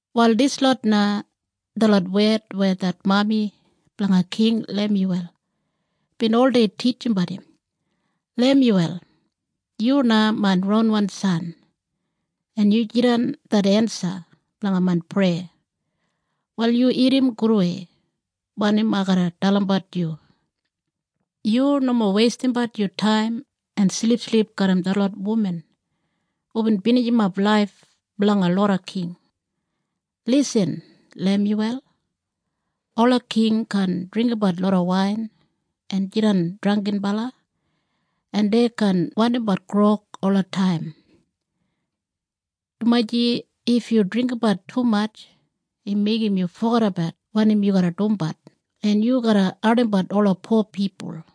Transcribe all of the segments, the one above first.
Wal dislot na detlot wed weya det mami blanga King Lemyuwel bin oldei titjimbat im, “Lemyuwel, yu na main ronwan san en yu jidan det ensa blanga main preya. Wal yu irrim gudwei wanim ai garra dalimbat yu. Yu nomo weistimbat yu taim en silipsilip garram detlot wuman hubin binijimap laif blanga loda king. Lisin Lemyuwel! Ola king kaan dringgimbat loda wain en jidan drangginbala en dei kaan wandimbat grog olataim. Dumaji if yu dringgimbat tumatj im meigim yu fogedabat wanim yu garra dumbat en yu garra ardimbat ola po pipul.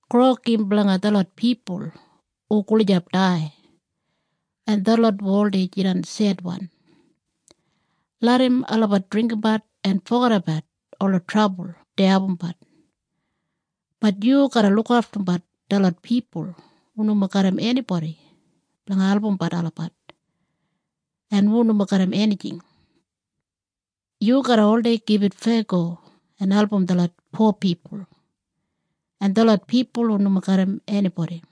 Grog im blanga detlot pipul hu gulijap dai en detlot hu oldei jidan sedwan. Larram olabat dringgimbat en fogedabat ola trabul dei abumbat. “Bat yu garra lukaftumbat detlot pipul hu nomo garram enibodi blanga albumbat olabat en hu nomo garram enijing. Yu garra oldei gibit feyago en album detlot po pipul en detlot pipul hu nomo garram enibodi.”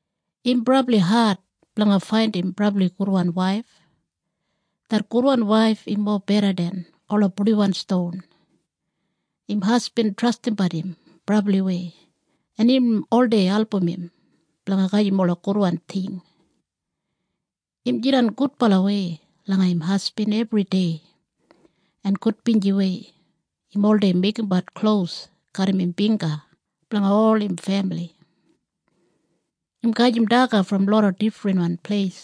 Im brabli ad blanga faindim brabli gudwan waif. Det gudwan waif im mobeda den ola purdiwan ston. Im hasbin trastimbat im brabliwei en im oldei album im blanga gajim ola gudwan ting. Im jidan gudbalawei langa im hasbin ebridei, en gudbinjiwei im oldei meigimbat klos garram im bingga blanga ol im femili. Im gajim daga brom loda difrinwan pleis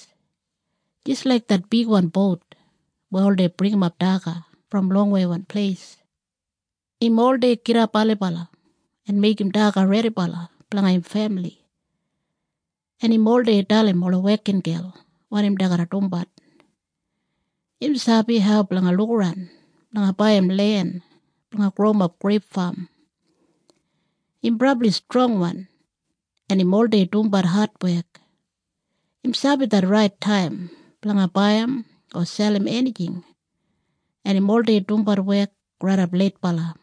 jis laik det bigwan bout weya oldei bringimap daga brom longweiwan pleis. Im oldei gidap ailibala en meigim daga redibala blanga im femili en im oldei dalim ola wekingel wanim dei garra dumbat. Im sabi hau blanga lukaran blanga baiyim len blanga growimap greip fam. Im brabli strongwan en im oldei dumbat adwek. Im sabi det rait taim blanga baiyim o selim enijing en im oldei dumbat wek raidap leitbala.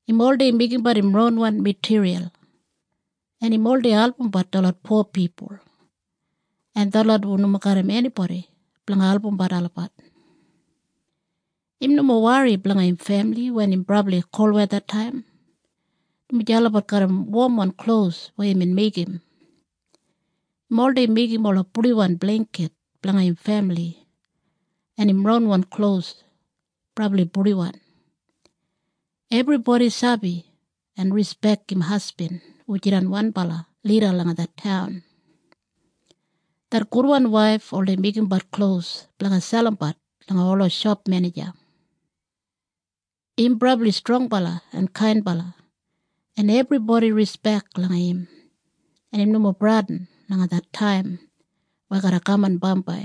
Im oldei meigimbat im ronwan matiriyal, en im oldei albumbat detlot po pipul en detlot hu nomo garram enibodi blanga albumbat olabat. Im nomo wori blanga im femili wen im brabli kolwethataim, dumaji olabat garram womwan klos weya imbin meigim. Im oldei meigim ola purdiwan bleingkit blanga im femili, en im ronwan klos brabli purdiwan. Ebribodi sabi en rispek im hasbin hu jidan wanbala lida langa det taun. Det gudwan waif oldei meigimbat klos blanga selimbat langa ola shopmenija. Im brabli strongbala en kainbala, en ebribodi rispek langa im en im nomo bradin langa det taim weya garra kaman bambai.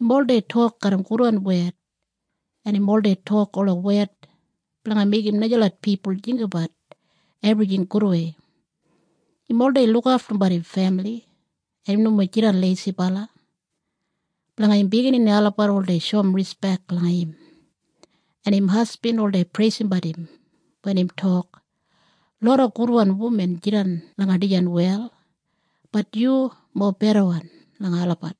Im oldei tok garram gudwan wed en im oldei tok ola wed blanga meigim najalot pipul jinggabat ebrijing gudwei. Im oldei lukaftumbat im femili en im nomo jidan leisibala. Blanga im biginini olabat oldei shoum rispek langa im. En im hasbin oldei preisimbat im wen im tok, “Loda gudwan wuman jidan langa dijan wel, bat yu mobedawan langa olabat.”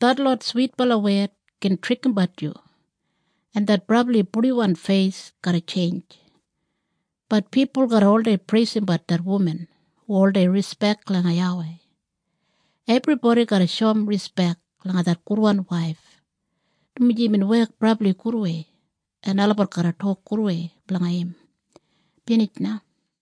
Detlot switbala wed gin trikimbat yu en det brabli purdiwan feis garra tjeinj, bat pipul garra oldei preisimbat det wuman hu oldei rispek langa YAWEI. Ebribodi garra shoum rispek langa det gudwan waif, dumaji imbin wek brabli gudwei, en olabat garra tok gudwei blanga im. Binij na.